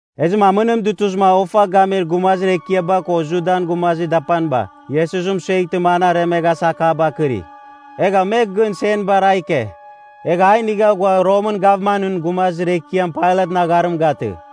Ezɨma amɨnim dutuzɨma ofa gamir gumazir ekiaba ko Judan gumazir dapaniba Iesus mɨsueghtɨma an aremighasa akabar kɨri. Egha me gɨn senbar a ike, egha a inigha ghua Romɨn gavmanɨn gumazir ekiam Pailatɨn agharim gatɨ.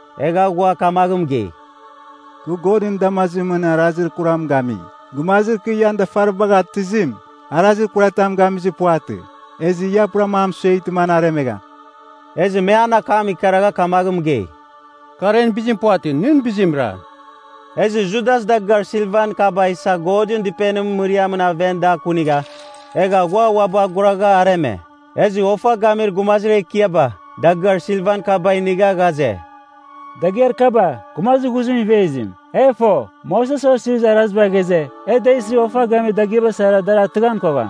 Egha ghua kamaghɨn mɨgei, “Kɨ Godɨn damazimɨn arazir kuram gami. Gumazir kɨ ian dafaribagh atɨzim, arazir kuratam gamizir puvatɨ. Ezɨ ia purama a mɨsueghtɨ an aremegham.” Ezɨ me an akam ikaragha kamaghɨn mɨgei, “Kar en bizim puvatɨ. Nɨn bizimra.” Ezɨ Judas dagɨar silvan kaba isa Godɨn Dɨpenimɨn mɨriamɨn aven da kunigha, egha ghua uabɨ aguragha areme. Ezɨ ofa gamir gumazir ekiaba, dagɨar silvan kaba inigha ghaze, “Dagɨar kaba, gumazir ghuzimɨn ivezim. E fo, Moses Osirizir Araziba ghaze, e da isɨ ofa gamir dagɨaba sara dar atɨghan kogham.”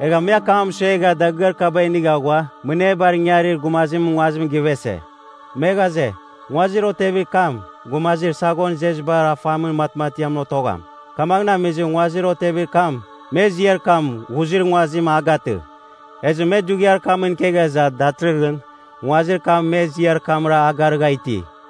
Egha me akam mɨsuegha dagɨar kaba inigha ghua Mɨnebar Ingangarir Gumazimɨn Nguazim givese. Me ghaze, nguazir otevir kam, gumazir saghon izezibar afamin matmatiamɨn otogham. Kamaghɨn amizɨ, nguazir otevir kam, me ziar kam “Ghuzir Nguazim” a gatɨ. Ezɨ me dughiar kamɨn ikegha iza, datɨrɨghɨn, nguazir kam me ziar kamra a garɨgha iti.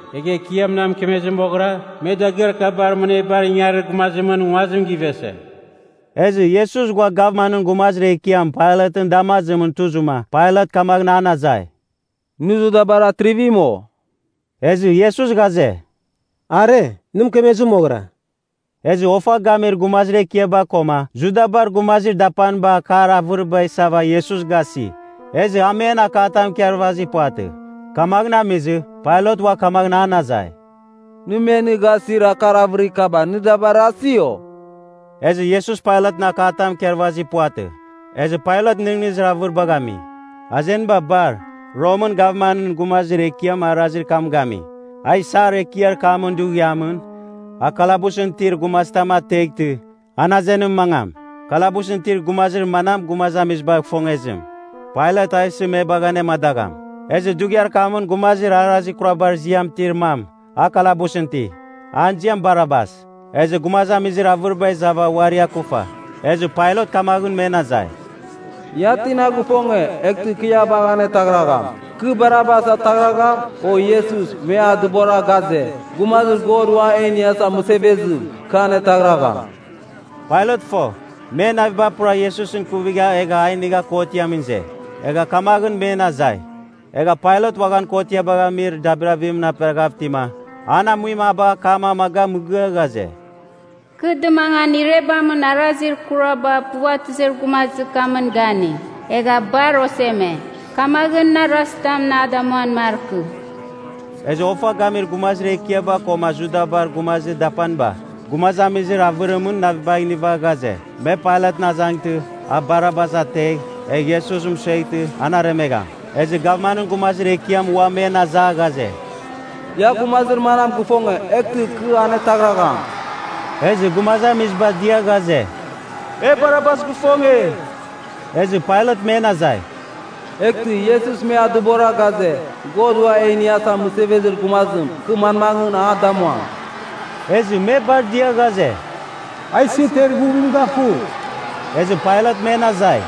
Egha Ekiam na mɨkemezɨ moghɨra, me dagɨar kabar Mɨnebar Ingarir Gumazimɨn Nguazim givese.” Ezɨ Iesus ghua gavmanɨn gumazir ekiam Pailatɨn damazimɨn tuzɨma Pailat kamaghɨn an azai, “Nɨ Judabar atrivim, o?” Ezɨ Iesus ghaze, “Are, nɨ mɨkemezɨ moghɨra.” Ezɨ ofa gamir gumazir ekiaba koma Judabar gumazir dapaniba akar avɨriba isava Iesus gasi. Ezɨ a men akatam ikarvazir puvatɨ. Kamaghɨn amizɨ, Pailat ua kamaghɨn an azai, “Nɨ me nɨ gasir akar avɨrir kaba, nɨ da barazi, o?” Ezɨ Iesus Pailatɨn akatam ikarvazir puvatɨ, ezɨ Pailat nɨghnɨzir avɨribagh ami. Azeniba bar, Romɨn gavmanɨn gumazir ekiam arazir kam gami, a isar ekiar kamɨn dughiamɨn, a kalabusɨn itir gumazitam ateghtɨ, an azenimɨn mangam. Kalabusɨn itir gumazir manam gumazamiziba ifongezim, Pailat a isɨ me bagh anemadagham. Ezɨ dughiar kamɨn gumazir arazir kurabar ziam itir mam, a kalabusɨn iti. An ziam Barabas. Ezɨ gumazamizir avɨriba izava uari akufa, ezɨ Pailat kamaghɨn men azai, “Ia tina gifonge, eghtɨ kɨ ia bagh anetaghragham. Kɨ Barabas ataghragham, o Iesus, me a dɨbora ghaze, ‘Gumazir God Uam E Iniasa Mɨsevezim,’ kɨ anetaghragham?” Pailat fo, men naviba pura Iesusɨn ikuvigha egha a inigha kotiamɨn ize, egha kamaghɨn men azai. Egha Pailat uaghan kotiabagh amir dabirabimɨn aperaghav itima, an amuim a bagha akam amaga mɨgɨa ghaze, “Kɨ dɨmangan irebamɨn arazir kuraba puvatɨzir gumazir kamɨn gani, egha bar oseme. Kamaghɨn, nɨ arazitam a damuan markɨ.” Ezɨ ofa gamir gumazir ekiaba koma Judabar gumazir dapaniba, gumazamizir avɨrimɨn navibagh iniva ghaze, me Pailatɨn azangtɨ, a Barabas ategh, egh Iesus mɨsueghtɨ, an aremegham. Ezɨ gavmanɨn gumazir ekiam ua men aza ghaze, “Ia gumazir manam gifonge, eghtɨ kɨ anetaghragham?” Ezɨ gumazamiziba dia ghaze, “E Barabas gifonge.” Ezɨ Pailat men azai, “Eghtɨ, Iesus me a dɨbora ghaze, ‘God Ua E Iniasa Mɨsevezir Gumazim,’ kɨ manmaghɨn a damuam?” Ezɨ me bar dia ghaze, “A isɨ ter ighuvim gafugh!” Ezɨ Pailat men azai,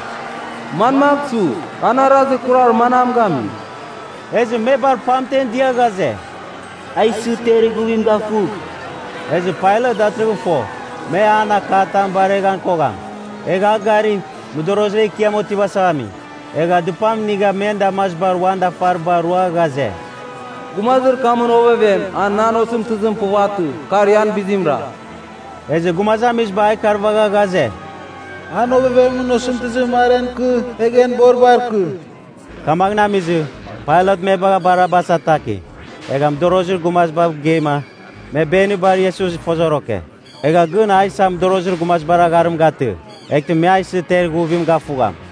“Manmagh su? An arazir kurar manam gami?” Ezɨ me bar pamten dia ghaze, “A isɨ ter ighuvim gafugh!” Ezɨ Pailat datɨrɨghɨn fo, me an akatam bareghan kogham. Egha a gari, mɨdorozir ekiam otivasava ami. Egha dɨpam inigha men damazibar uan dafariba rua ghaze, “Gumazir kamɨn ovevem, a nan osɨmtɨzim puvatɨ. Kar ian bizimra.” Ezɨ gumazamiziba a ikarvagha ghaze, “An ovevemɨn osɨmtɨzim mar en ikɨ, egh en boribar ikɨ.” Kamaghɨn amizɨ, Pailat me bagha Barabas ataki. Egha mɨdorozir gumazibav geima, me benibar Iesus ifozoroke. Egha gɨn a isa mɨdorozir gumazibar agharim gatɨ, eghtɨ me a isɨ ter ighuvim gafugham.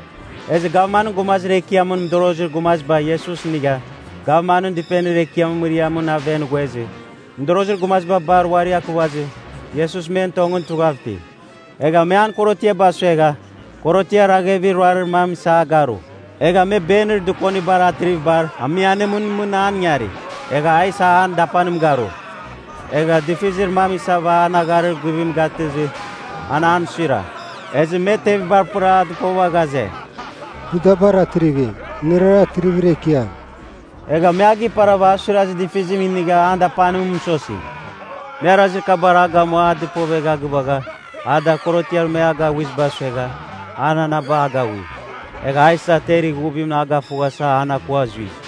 Ezɨ gavmanɨn gumazir ekiamɨn mɨdorozir gumaziba Iesus inigha, gavmanɨn dɨpenir ekiamɨn mɨriamɨn aven ghuezɨ, mɨdorozir gumaziba bar uari akuvazɨ, Iesus men tongɨn tughav iti. Egha me an korotiaba suegha, korotiar aghevir ruarir mam isa a garu. Egha me benir dɨkonibar atrivibar amianimɨn mɨn an ingari, egha a isa an dapanim garu. Egha difizir mam isava an agharir guvim gatɨzɨ, an an suira. Ezɨ me tevibar apɨra a dɨpova ghaze, “Judabar Atrivim, nɨrara atrivir ekiam!” Egha me a giparava a suirazir difizim inigha an dapanim mɨsosi. Me arazir kabar a gamua a dɨpovegha gɨvagha, a da korotiar me a agaghuiziba suegha, ua ananaba agaghui. Egha a isa ter ighuvim a gafughasa an akua zui.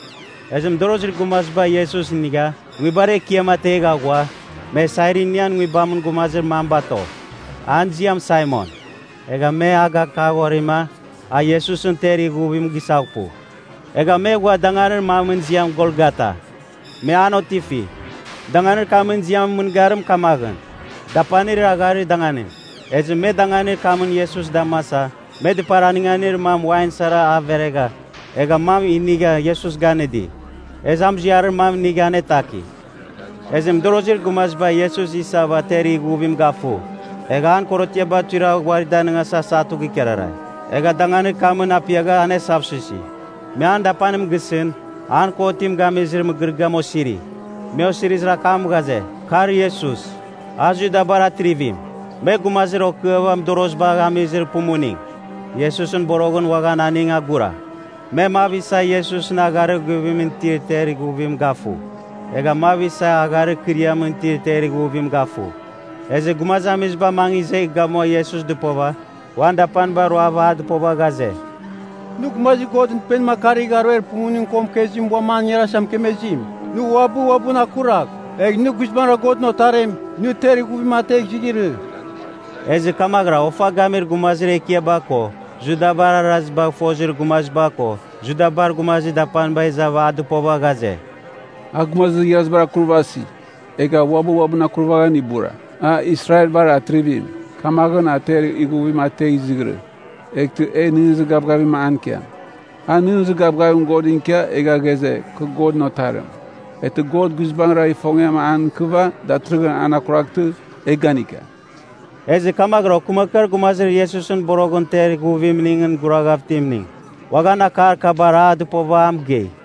Ezɨ mɨdorozir gumaziba Iesus inigha, nguibar ekiam ategha ghua, me Sairinian nguibamɨn gumazir mam bato. An ziam Saimon. Egha me a gakaghorima, a Iesusɨn ter ighuvim gisaghpu. Egha me ghua danganir mamɨn ziam Golgata, me an otifi. (Danganir kamɨn ziamɨn mɨngarim kamaghɨn, Dapanir Agharir Danganim.) Ezɨ me danganir kamɨn Iesus damasa me dɨpar anɨnganir mam wain sara a veregha, egha mam inigha Iesus ganɨdi. Ezɨ a muziarir mam inigha anetaki. Ezɨ mɨdorozir gumaziba Iesus isava ter ighuvim gafu. Egha an korotiaba tuiragh uari danɨngasa satu gikararai. Egha danganir kamɨn apiagha anesavsuisi. Me an dapanim gisɨn, an kotim gamizir mɨgɨrɨgɨam osiri. Me osirizir akam ghaze, “Kar Iesus, a Judabar Atrivim.” Me gumazir okɨava mɨdorozibagh amizir pumuning, Iesusɨn boroghɨn uaghan aning agura. Me mav isa Iesusɨn agharir guvimɨn itir ter ighuvim gafu, egha mav isa agharir ikɨriamɨn itir ter ighuvim gafu. Ezɨ gumazamiziba mangɨ izegh gamua Iesus dɨpova, uan dapaniba roava a dɨpova ghaze, “Nɨ, gumazir Godɨn Dɨpenim akarigh aruer pumuning ko mɨkezimɨn uam an ingarasa mɨkemezim! Nɨ uabɨ uabɨn akuragh! Egh nɨ guizbangɨra Godɨn Otarim, nɨ ter ighuvim ategh izighirɨ.” Ezɨ kamaghɨra ofa gamir gumazir ekiaba ko Judabar arazibagh fozir gumaziba ko Judabar gumazir dapaniba izava a dɨpova ghaze, “A gumazir igharazibar akurvasi, egha uabɨ uabɨn akurvaghan ibura. A Israelbar Atrivim, kamaghɨn a ter ighuvim ategh izighirɨ, eghtɨ e nɨghnɨzir gavgavim an ikiam. A nɨghnɨzir gavgavim Godɨn ikia, egha ghaze, kɨ Godɨn Otarim. Eghtɨ God guizbangɨra ifongiam an ikɨva, datɨrɨghɨn an akuraghtɨ, e ganika!” Ezɨ kamaghɨra okɨmakɨar gumazir Iesus boroghɨn ter ighuvimningɨn guraghav itimning, uaghan akar kabar a dɨpova a mɨgei.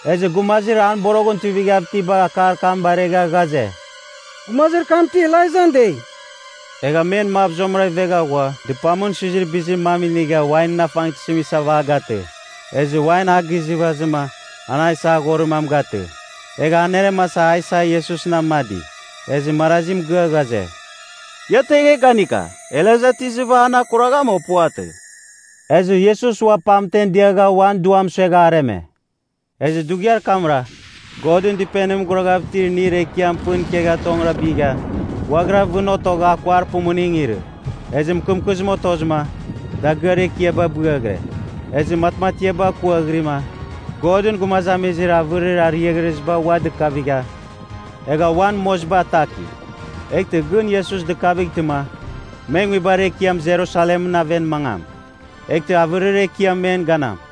Ezɨ gumazir an boroghɨn tuivighav itiba akar kam baregha ghaze, “Gumazir kam ti Elaijan dei.” Egha men mav zuamɨra ivegha ghua dɨpamɨn suizir bizir mam inigha wainɨn afangtɨzim isava a gatɨ. Ezɨ wain a gizɨvazɨma, an a isa aghorir mam gatɨ. Egha aneremasa a isa Iesusɨn amadi. Ezɨ marazi mɨgɨa ghaze, “Ia tegh, e ganika, Elaija ti izɨva an akuragham, o puvatɨ.” Ezɨ Iesus ua pamtem diagha uan duam suegha areme. Ezɨ dughiar kamra, Godɨn Dɨpenimɨn guraghav itir inir ekiam pɨn ikegha tongɨra bigha, ghuaghira vɨn otogha akuar pumuning irɨ. Ezɨ mɨkɨmkɨzim otozɨma, dagɨar ekiaba bɨaghire. Ezɨ matmatiaba kuaghɨrima, Godɨn gumazamizir avɨrir ariaghreziba ua dikavigha, egha uan moziba ataki. Eghtɨ gɨn Iesus dɨkavightɨma, me nguibar ekiam Jerusalemɨn aven mangam. Eghtɨ avɨrir ekiam men ganam.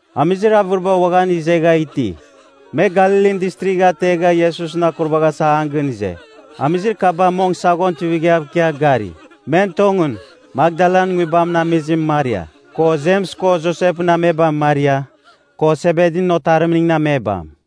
Amizir avɨriba uaghan izegha iti. Me Galilin Distrigh ategha Iesusɨn akurvaghasa an gɨn ize. Amizir kaba mong saghon tuivighav ikia gari. Men tongɨn, Makdalan nguibamɨn amizim Maria, ko Jems ko Josepɨn amebam Maria, ko Sebedin otarimningɨn amebam.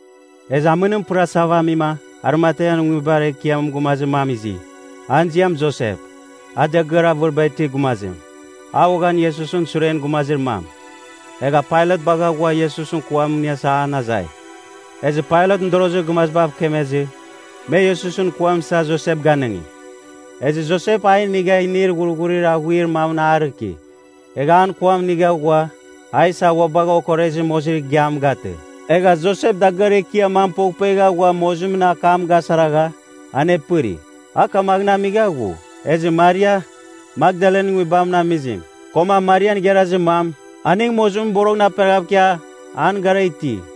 Ezɨ amɨnim pɨrasava amima, Arimatean nguibar ekiamɨn gumazir mam izi. An ziam Josep, a dagɨar avɨriba itir gumazim. A uaghan Iesusɨn suren gumazir mam. Egha Pailat bagha ghua Iesusɨn kuam iniasa an azai. Ezɨ Pailat mɨdorozir gumazibav kemezɨ, me Iesusɨn kuam isa Josep ganɨngi. Ezɨ Josep a inigha inir ghurghurir aghuir mamɨn a rɨki. Egha an kuam inigha ghua, a isa ua bagha okorezir mozir igiam gatɨ. Egha Josep dagɨar ekiar mam poghpuegha ghua mozimɨn akam gasaragha, anepɨri. A kamaghɨn amigha ghu. Ezɨ Maria, Makdalan nguibamɨn amizim, koma Marian igharazir mam, aning mozimɨn boroghɨn aperaghav ikia, an gara iti.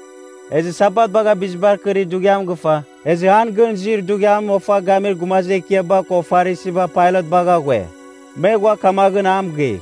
Ezɨ Sabat bagha bizibar kɨrir dughiam gɨfa, ezɨ an gɨn izir dughiamɨn ofa gamir gumazir ekiaba ko Farisiba Pailat bagha ghue. Me ghua kamaghɨn a mɨgei,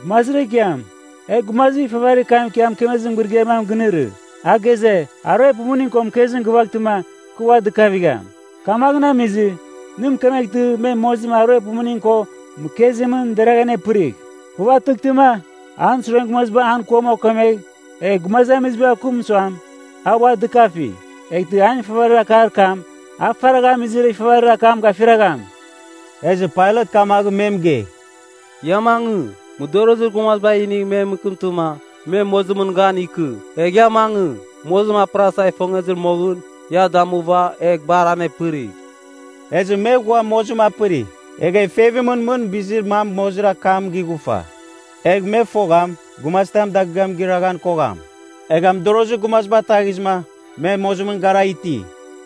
“Gumazir ekiam, e gumazir ifavarir kam ikia mɨkemezir mɨgɨrɨgɨar mam ginɨrɨ. A ghaze, ‘Aruer pumuning ko mɨkezim gɨvaghtɨma kɨ ua dɨkavam.’ Kamaghɨn amizɨ, nɨ mɨkemeghtɨ, me mozim aruer pumuning ko mɨkezimɨn deragh anepɨrigh. Puvatɨghtɨma, an suren gumaziba an kuam okemegh, egh gumazamizibav kɨm suam, a ua dɨkafi. Eghtɨ an ifavarir akar kam, a faragha amizir ifavarir akam gafiragham.” Ezɨ Pailat kamaghɨn me mɨgei, “Ia mangɨ, mɨdorozir gumaziba inigh me mɨkɨmtɨma, me mozimɨn gan ikɨ. Egh ia mangɨ, mozim apɨrasa ifongezɨ moghɨn, ia damuva, egh bar anepɨrigh.” Ezɨ me ghua mozim apɨri. Egha ifevimɨn mɨn bizir mam mozir akam gighufa, egh me fogham, gumazitam dagɨam gɨraghan kogham. Egha mɨdorozir gumaziba ataghizɨma, me mozimɨn gara iti.